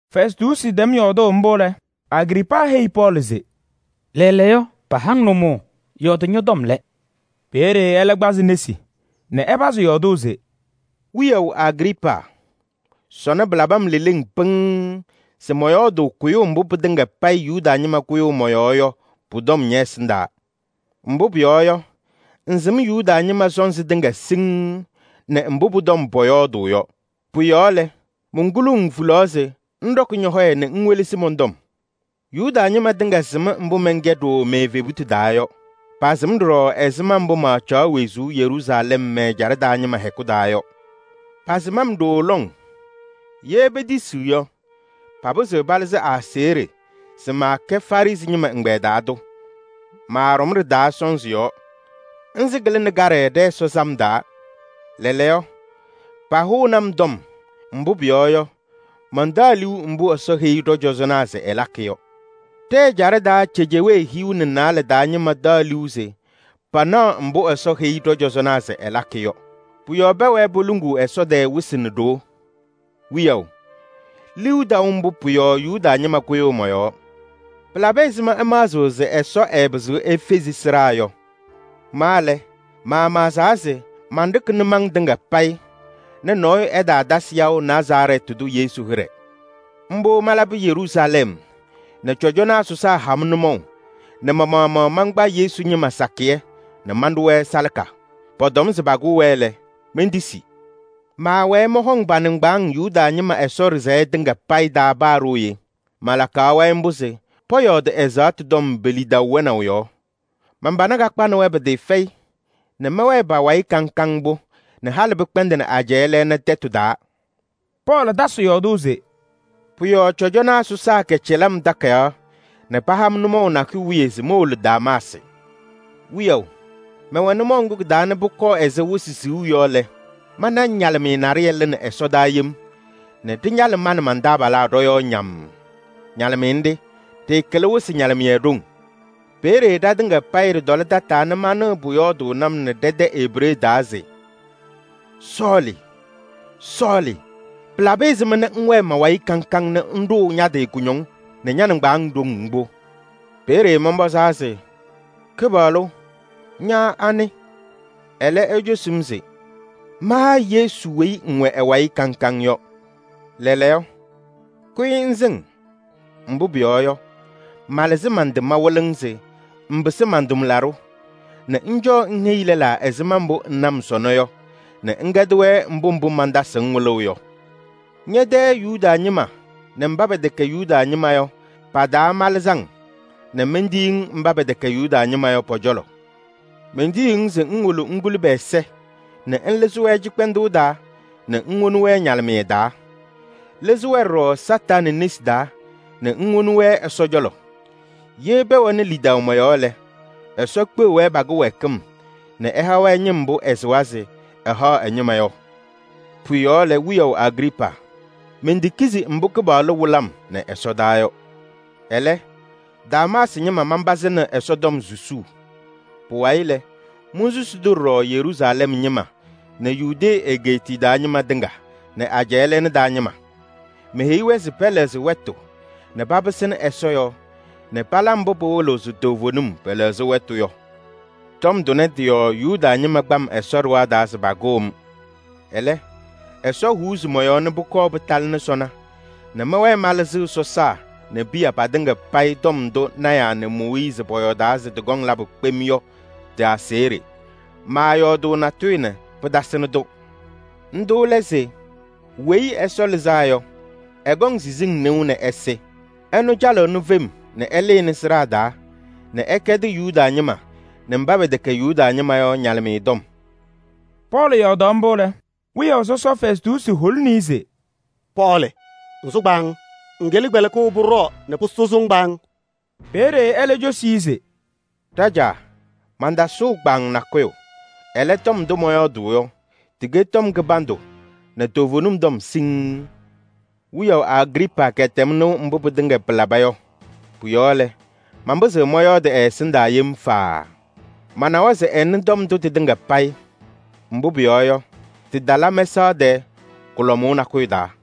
Fɛstuusi tɛm yɔɔdʋʋ mbʋ lɛ, Agriipaa heyi Pɔɔlɩ se: “Lɛɛlɛɛyɔ, paha-ŋ nʋmɔʋ, yɔɔdɩ ñɔ-tɔm lɛ.” Peeye ɛlɛ kpazɩ nesi nɛ ɛpazɩ yɔɔdʋʋ se: “Wiyaʋ Agriipaa! Sɔnɔ pɩlabɩ-m leleŋ pɩŋŋ se mɔyɔɔdʋʋ kʋyʋʋ mbʋ pɩtɩŋa payɩ Yuda ñɩma kʋyʋʋ mɔ-yɔɔ yɔ pʋ-tɔm ñɛ-ɛsɩndaa. Mbʋ pʋyɔɔ yɔ, ŋsɩm Yuda ñɩma sɔnzɩ tɩŋa siŋŋ nɛ mbʋ pʋ-tɔm pɔyɔɔdʋʋ yɔ. Pʋ-yɔɔ lɛ, monkuluu-ŋ hulaɣ se ŋɖɔkɩ ñɔ-hɔyɛ nɛ ŋwelesi mɔn-tɔm. Yuda ñɩma tɩŋa sɩm mbʋ mɛnkɛ ɖooo me-evebutu taa yɔ. Pasɩm ɖɔɖɔ ɛzɩma mbʋ maacaɣ wezuu Yeruusalɛm mɛ-ɛjaɖɛ taa ñɩma hɛkʋ taa yɔ. Pasɩm-m ɖooo lɔŋ, ye petisiɣ yɔ, papɩzɩɣ palɩzɩ aseɣɖe se maakɛ Farɩsɩ ñɩma ɛgbɛyɛ taa tʋ. Maaɖɔm ɖɩ-taa sɔnzɩ yɔɔ. Nzɩ kɩlɩnɩ kaɖɛ ɖɛ-Ɛsɔ sam taa. Lɛɛlɛɛyɔ, pahʋʋnɩ-m. Mbʋ pʋyɔɔ yɔ, mantaɣ liu mbʋ Ɛsɔ heyi ɖɔ-cɔzɔnaa se ɛlakɩ yɔ. Ɖɛ-ɛjaɖɛ taa cejewee hiu nɛ naalɛ taa ñɩma taɣ liu se panaɣ mbʋ Ɛsɔ heyi ɖɔ-cɔzɔnaa se ɛlakɩ yɔ. Pʋ-yɔɔ pɛwɛɛ poluŋuu Ɛsɔ tɛɛ wɩsɩ nɛ ɖoo. Wiyaʋ! Liu taʋ mbʋ, pʋ-yɔɔ Yuda ñɩma kʋyʋʋ mɔ-yɔɔ. Pɩlabɩ ɛzɩma ɩmaɣzɩɣ se Ɛsɔ ɛɛpɩzɩɣ efezi sɩɖaa yɔ? Ma lɛ, maamaɣzaa se manɖɩkɩ nʋmɔŋ tɩŋa payɩ nɛ nɔɔyʋ ɛtaatasɩ yaʋ Nazarɛɛtɩ tʋ Yesu hɩɖɛ. Mbʋ malabɩ Yeruusalɛm nɛ cɔjɔnaa sɔsaa ha-m nʋmɔʋ nɛ ma-maɣmaɣ mankpa Yesu ñɩma sakɩyɛ nɛ manɖʋ-wɛ salaka. Pɔtɔm se pakʋʋ-wɛ lɛ, mentisi. Manpam hɔm pa-nɩŋgbaaŋ Yuda ñɩma Ɛsɔ ɖɩsɛyɛ tɩŋa payɩ taa. Malakaɣ-wɛ mbʋ se pɔyɔɔdɩ ɛzaɣtʋ tɔm pe-lidaʋ wɛnaʋ yɔɔ. Man-pana kakpanɩ-wɛ pɩtɩɩfɛyɩ nɛ mɛwɛɛ pa-wayɩ kaŋ kaŋ mbʋ nɛ halɩ pɩkpɛndɩnɩ ajɛɛ lɛɛna tɛtʋ taa.” Pɔɔlɩ tasɩ yɔɔdʋʋ se: “Pʋ-yɔɔ cɔjɔnaa sɔsaa kɛcɛlɩ-m takayaɣ nɛ paha-m nʋmɔʋ nakʋyʋ wiye se mowolo Damaasɩ. Wiyaʋ! Mɛwɛ nʋmɔʋ ŋgʋ kɩ-taa nɛ pʋkɔɔ ɛzɩ wɩsɩ siɣu yɔ lɛ, mana ñalɩmɩyɛ naɖɩyɛ lɩnɩ ɛsɔdaa yem nɛ ɖɩñalɩ ma nɛ man-taabalaa ɖɔ-yɔɔ ñammm. Ñalɩmɩyɛ nɖɩ, ɖɩɩkɩlɩ wɩsɩ ñalɩmɩyɛ ɖoŋ. Peeye ɖatɩŋa payɩ ɖɩtɔlɩ tataa nɛ manɩɣ pʋyɔɔdʋʋnɩ-m nɛ ɖɛ-tɛ Ebree taa se: ‘Sɔɔlɩ! Sɔɔlɩ! Pɩlabɩ ɛzɩma nɛ ŋwɛɛ ma-wayɩ kaŋ kaŋ nɛ ŋɖʋʋ ña-tɩ kʋñɔŋ nɛ ña-nɩŋgbaaŋ ɖoŋ mbʋ?’ Peeye mɔnpɔzaa se: ‘Kɩpaɣlʋ! Ña anɩ?’ Ɛlɛ cosi-m se: ‘Ma Yesu weyi ŋwɛ ɛ-wayɩ kaŋ kaŋ yɔ. Ɛlɛ, kʋyɩ ŋsɩŋ ña-nasɩ taa. Mbʋ pʋyɔɔ yɔ, malɩzɩ man-tɩ mawɩlɩ-ŋ se ŋpɩsɩ man-tʋmlaɖʋ nɛ ŋcɔɔ ŋheyi lɛlaa ɛzɩma mbʋ ŋna-m sɔnɔ yɔ nɛ ŋkɛdɩ-wɛ mbʋ mbʋ mantasɩɣ-ŋ wɩlʋʋ yɔ. Ñɛ-tɛ Yuda ñɩma nɛ mba pɛtɛkɛ Yuda ñɩma yɔ pa-taa malɩzɩ-ŋ nɛ mentiyi-ŋ mba pɛtɛkɛ Yuda ñɩma yɔ pɔ-cɔlɔ. Mentiyiɣ-ŋ se ŋwolo ŋkuli pɛ-ɛza nɛ ŋlɩzɩ-wɛ cɩkpɛndʋʋ taa nɛ ŋwoni-wɛ ñalɩmɩyɛ taa. Lɩzɩ-wɛ ɖɔɖɔ Kañadʋ Satanɩ nesi taa nɛ ŋwoni-wɛ Ɛsɔ cɔlɔ. Ye pɛwɛnɩ lidaʋ mɔ-yɔɔ lɛ, Ɛsɔ kpeɣ-wɛ pa-kɩwɛɛkɩm nɛ ɛha-wɛ ñɩm mbʋ ɛsɩwa se ɛhaɣ ɛ-ñɩma yɔ.’” “Pʋ-yɔɔ lɛ, wiyaʋ Agriipaa! Mentekizi mbʋ Kɩpaɣlʋ wɩlɩ-m nɛ ɛsɔdaa yɔ. Ɛlɛ, Damaasɩ ñɩma manpazɩnɩ Ɛsɔtɔm susuu. Pʋwayɩ lɛ, monsusi-tʋ ɖɔɖɔ Yeruusalɛm ñɩma nɛ Yudee egeetiye taa ñɩma tɩŋa nɛ ajɛɛ lɛɛna taa ñɩma. Meheyi-wɛ se pɛlɛɣzɩ wɛtʋ nɛ papɩsɩnɩ Ɛsɔ yɔɔ nɛ pala mbʋ pɩwɩlɩɣ se toovenim pɛlɛɣzɩ wɛtʋ yɔ. Tɔm tʋnɛ tɩ-yɔɔ Yuda ñɩma kpa-m Ɛsɔ ɖɩɣa taa se pakʋʋ-m. Ɛlɛ, Ɛsɔ huuzi mɔ-yɔɔ nɛ pʋkɔɔ pɩtalɩnɩ sɔnɔ nɛ mɛwɛɛ malɩzɩɣ sɔsaa nɛ piya patɩŋa payɩ tɔm ndʋ lɔɔyɩsɩ tɩnaa nɛ Mooyiizi pɔyɔɔdaa se tɩkɔŋ labʋ kpem yɔ tɩ-aseɣɖe. Maayɔɔdʋʋ natʋyʋ nɛ pɩtasɩnɩ-tʋ. Ndʋ lɛ se: ‘Weyi Ɛsɔ Lɩzaa Yɔ, ɛkɔŋ siziŋ nɩʋ nɛ ɛsɩ. Ɛnʋ calɩɣnɩ fem nɛ ɛlɩnɩ sɩɖaa taa nɛ ɛkɛdɩ Yuda ñɩma nɛ mba pɛtɛkɛ Yuda ñɩma yɔ ñalɩmɩyɛ tɔm.’” Pɔɔlɩ hʋwaɣ mbʋ lɛ, wiyaʋ sɔsɔ Fɛstuusi holini-i se: “Pɔɔlɩ ŋsʋ kpaaŋ! Ŋkɩlɩ kpɛlɩkʋʋ sɔsɔm nɛ pʋsʋsɩ-ŋ kpaaŋ!” Peeye ɛlɛ cosi-i se: “Ɖajaa! Mantasʋʋ kpaaŋ nakʋyʋ, ɛlɛ, tɔm ndʋ mɔyɔɔdʋʋ yɔ, tɩkɛ tɔm kɩbandʋ nɛ toovenim tɔm siŋŋ. Wiyaʋ Agriipaa kɛtɛm nɩʋ mbʋ pɩtɩŋa pɩlaba yɔ. Pʋ-yɔɔ lɛ, manpɩzɩɣ mɔyɔɔdɩ ɛ-ɛsɩndaa yem faaa. Manawa se ɛnɩ tɔm ndʋ tɩtɩŋa payɩ. Mbʋ pʋyɔɔ yɔ, tɩtala mɛsaɣ tɛɛ kʋlɔmʋʋ nakʋyʋ taa.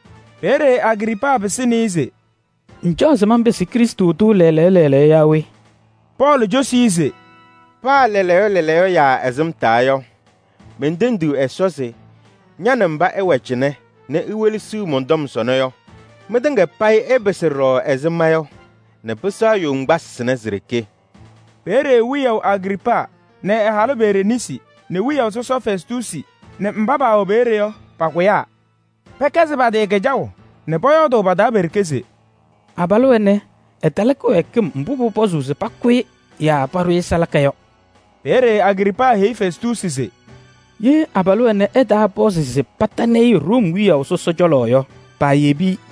Peeye Agriipaa pɩsɩnɩ-ɩ se: “Ŋcaɣ se manpɩsɩ Krɩstʋ tʋ lɛɛlɛɛyɔ lɛɛlɛɛyɔ yaa we?” Pɔɔlɩ cosi-i se: “Paa lɛɛlɛɛyɔ lɛɛlɛɛyɔ yaa ɛsɩmtaa yɔ, mentendiɣ Ɛsɔ se ña nɛ mba ɩwɛ cɩnɛ nɛ iwelesiɣ mɔn-tɔm sɔnɔ yɔ, mɩtŋa payɩ ɩpɩsɩ ɖɔɖɔ ɛzɩ ma yɔ nɛ pɩsɛɣ yoŋgbasɩ sɩnɛ si-ɖeke!” Peeye wiyaʋ Agriipaa nɛ ɛ-halʋ Bereniisi nɛ wiyaʋ sɔsɔ Fɛstuusi nɛ mba paawɛ peeye yɔ, pakʋyaa pɛkɛzɩ pa-tɩ kɩjaʋ nɛ pɔyɔɔdʋʋ pa-taa pe-ɖeke se: “Abalʋ ɛnɛ, ɛtala kɩwɛɛkɩm mbʋ pʋpɔzʋʋ se pakʋ-ɩ yaa paɖʋ-ɩ salaka yɔ.” Peeye Agriipaa heyi Fɛstuusi se: “Ye abalʋ ɛnɛ ɛtaapɔzɩ se patanɩ-ɩ Room wiyaʋ sɔsɔ cɔlɔ yɔ, paayebi-i!”